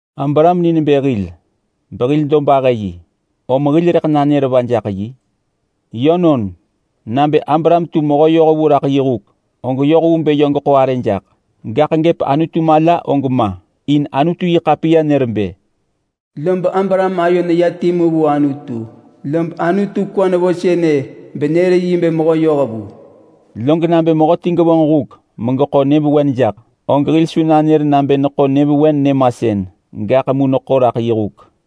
Abraham ni nebë hil behil dobahë yi. Om hil rëḳ nanër va jaḳ yi? Yönon, nabë Abraham tu mehö yohvu raḳ yi huk, og yoh vu bë yö geḳo arë jaḳ. Gaḳ gëp Anutu mala og ma! In Anutu-yi-ḳapiya nër bë, “Abraham ayo neya timu vu Anutu, lob Anutu kwa nevo benër yi nebë mehö yohvu.” Log nabë mehöti gevonġ huk megeḳo monë jaḳ, og hil su nanër nabë neḳo monë saga nyëmasën. Gaḳ mu neḳo raḳ yi huk.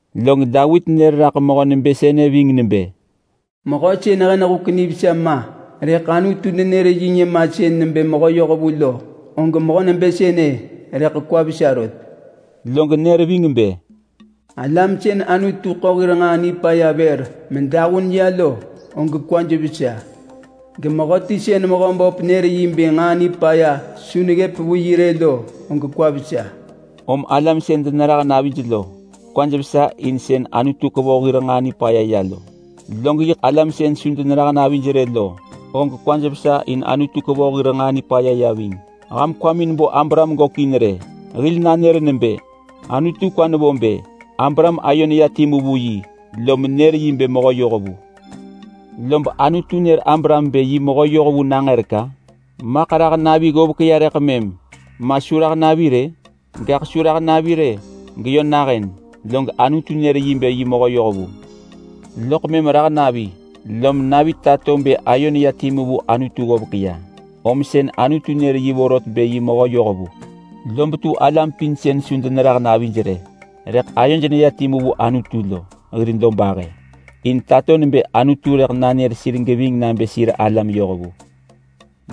Log Davit nër raḳ mehö nebë sënë ving nebë, “Mehöti sën hen huk nivesa ma, rëḳ Anutu nenër yi nyëmasën nebë mehö yohvu lo, og mehö nebë sënë rëḳ kwa vesa rot.” Log nër ving bë: “Alam sën Anutu ḳo hir nġaa nipaya vër medahun ya lo, og kwaj vesa! Gemehöti sën Mehöböp nër yi bë nġaa nipaya su neggëp vu yi rë lo, og kwa vesa.” Om alam sën denerah navij lo, kwaj vesa in sën Anutu kevoh hir nġaa nipaya ya lo, log yiḳ alam sën su denerah navij rë lo, og kwaj vesa in Anutu kevoh hir nġaa nipaya ya ving. Ham kwamin bo Abraham gökin rë! Hil nanër nebë: Anutu kwa nevo bë Abraham ayo neya timu vu yi lom nër yi nebë mehö yohvu. Lob Anutu nër Abraham nebë yi mehö yohvu nangërek-a? Maḳ rah navi ggovek ya rëḳ mëm, ma su rah navi rë? Gaḳ su rah navi rë geyö nahën, log Anutu nër yi nebë yi mehö yohvu. Loḳ mëm rah navi, lom navi tato bë ayo neya timu vu Anutu ggovek ya om sën Anutu nër yi vorot bë yi mehö yohvu. Lob tu alam pin sën su denerah navij rë rëḳ ayoj neya timu vu Anutu lo hir dobahë, in tato nebë Anutu rëḳ nanër sir geving nabë sir alam yohvu.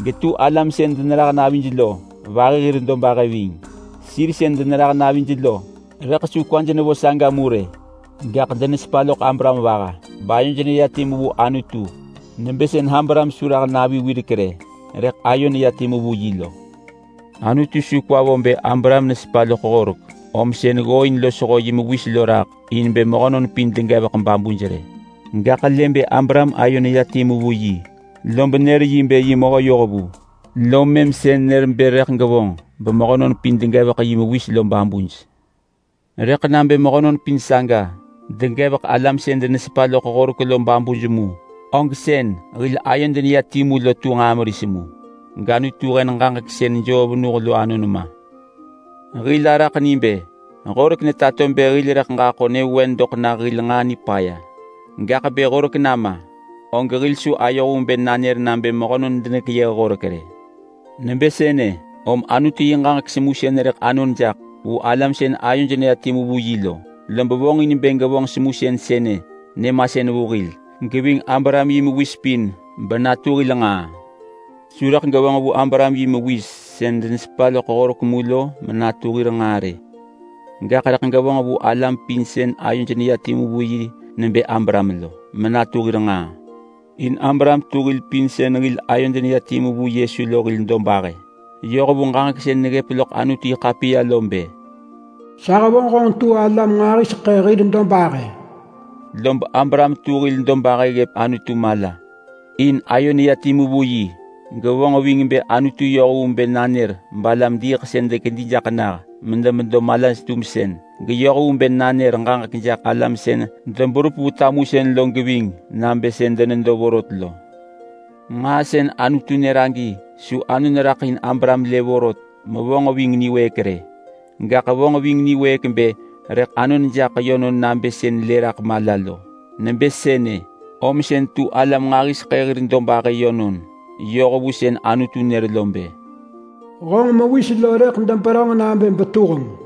Getu alam sën denerah navij lo vahi hir dobahë ving. Sir sën denerah navij lo rëḳ su kwaj nevo saga mu rë, gaḳ denesepa loḳ Abraham vaha bayoj neya timu vu Anutu, nebë sën Abraham su rah navi wirek rë, rëḳ ayo neya timu vu yi lo. Anutu su kwa vo bë Abraham nesepa loḳ horek om sën ggooin losho yi mewis lo raḳ in bë mehönon pin degevek babuj rë. Gaḳ lë bë Abraham ayo neya timu vu yi, lob nër yi bë yi mehö yohvu, lom mëm sën nër bë rëḳ gevonġ bemehönon pin degevek yi mewis lo babuj. Rëḳ nabë mehönon pin saga degevek alam sën denesepa loḳ horek lo babuj mu, og sën hil ayod neya timu lo tu nġaa meris mu, gAnutu hen ġaġek sën joo venuh lo anon ma. Hil araḳ ni bë horek netato bë hil rëḳ ġaḳo nyëvewen doḳ nah hil nġaa nipaya. Gaḳ bë horek nama, og hil su ayoh vu bë nanër nabë mehönon denekeyëh horek rë. Nebë sënë, om Anutu yi ġaġek semusën rëḳ anon jaḳ vu alam sën ayoj neya timu vu yi lo. Lob vonġin bë gevonġ semusën sënë nyëmasën vu hil geving Abraham yi mewis pin benatu hil nġaa. Su rëḳ gevonġ vu Abraham yi mewis sën denesepa loḳ horek mu lo menatu hir nġaa rë, gaḳ rëḳ gevonġ vu alam pin sën ayoj neya timu vu yi nebë Abraham lo menatu hir nġaa. In Abraham tu hil pin sën hil ayod neya timu vu Yesu lo hil dobahë. Yoh vu ġaġek sën neggëp loḳ Anutu-yi-ḳapiya lo bë: “Sa hevonġ honġ tu alam nġahiseḳë hir dobahë.” Lob Abraham tu hil dobahë ggëp Anutu mala in ayo neya timu vu yi. Gevonġ ving bë Anutu yoh vu bë nanër balam-diiḳsën dekedi jaḳ nah medemedo malaj-tumsën, geyoh vu bë nanër ġaġek jaḳ alam sën deberup vu tamusën lo geving nabë sën denedo vorot lo. Nġaa sën Anutu nër agi su anon raḳ in Abraham lë vorot mevonġ ving niwëëk rë, gaḳ vonġ ving niwëëk bë rëḳ anon jaḳ yönon nabë sën lë raḳ mala lo. Nebë sënë, om sën tu alam nġahiseḳë hir dobahë yönon yoh vu sën Anutu nër lo bë, “Honġ mewis lo rëḳ deberönġ nabë betuheng!”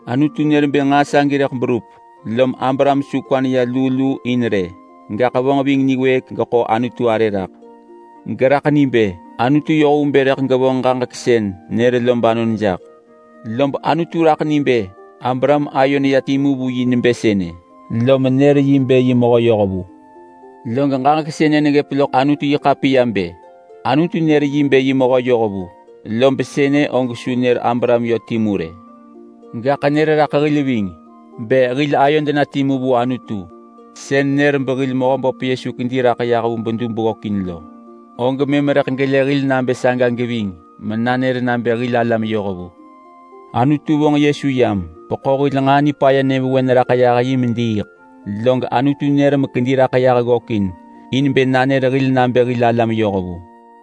Anutu nër bë nġaa sagi rëḳ berup, lom Abraham su kwa neya luu luu in rë. Gaḳ vonġ ving niwëëk geḳo Anutu arë raḳ, geraḳ ni bë Anutu yoh vu bë rëḳ gevonġ ġaġek sën nër lo banon jaḳ. Lob Anutu raḳ ni bë Abraham ayo neya timu vu yi nebë sënë, lom nër yi bë yi mehö yohvu. Log ġaġek sënë neggëp loḳ Anutu-yi-ḳapiya bë, “Anutu nër yi bë yi mehö yohvu.” Lob sënë og su nër Abraham yö timu rë. Gaḳ nër raḳ hil ving. Bë hil ayod na timu vu Anutu sën nër behil Mehöböp Yesu kedi raḳ yah vu bedub ggökin lo, og mëm rëḳ gelë hil nabë saga geving menanër nabë hil alam yohvu. Anutu vonġ Yesu yam beḳo hil nġaa nipaya nyëvewen raḳ yah yi mediiḳ. Log Anutu nër mekedi raḳ yah ggökin in bë nanër hil nabë hil alam yohvu.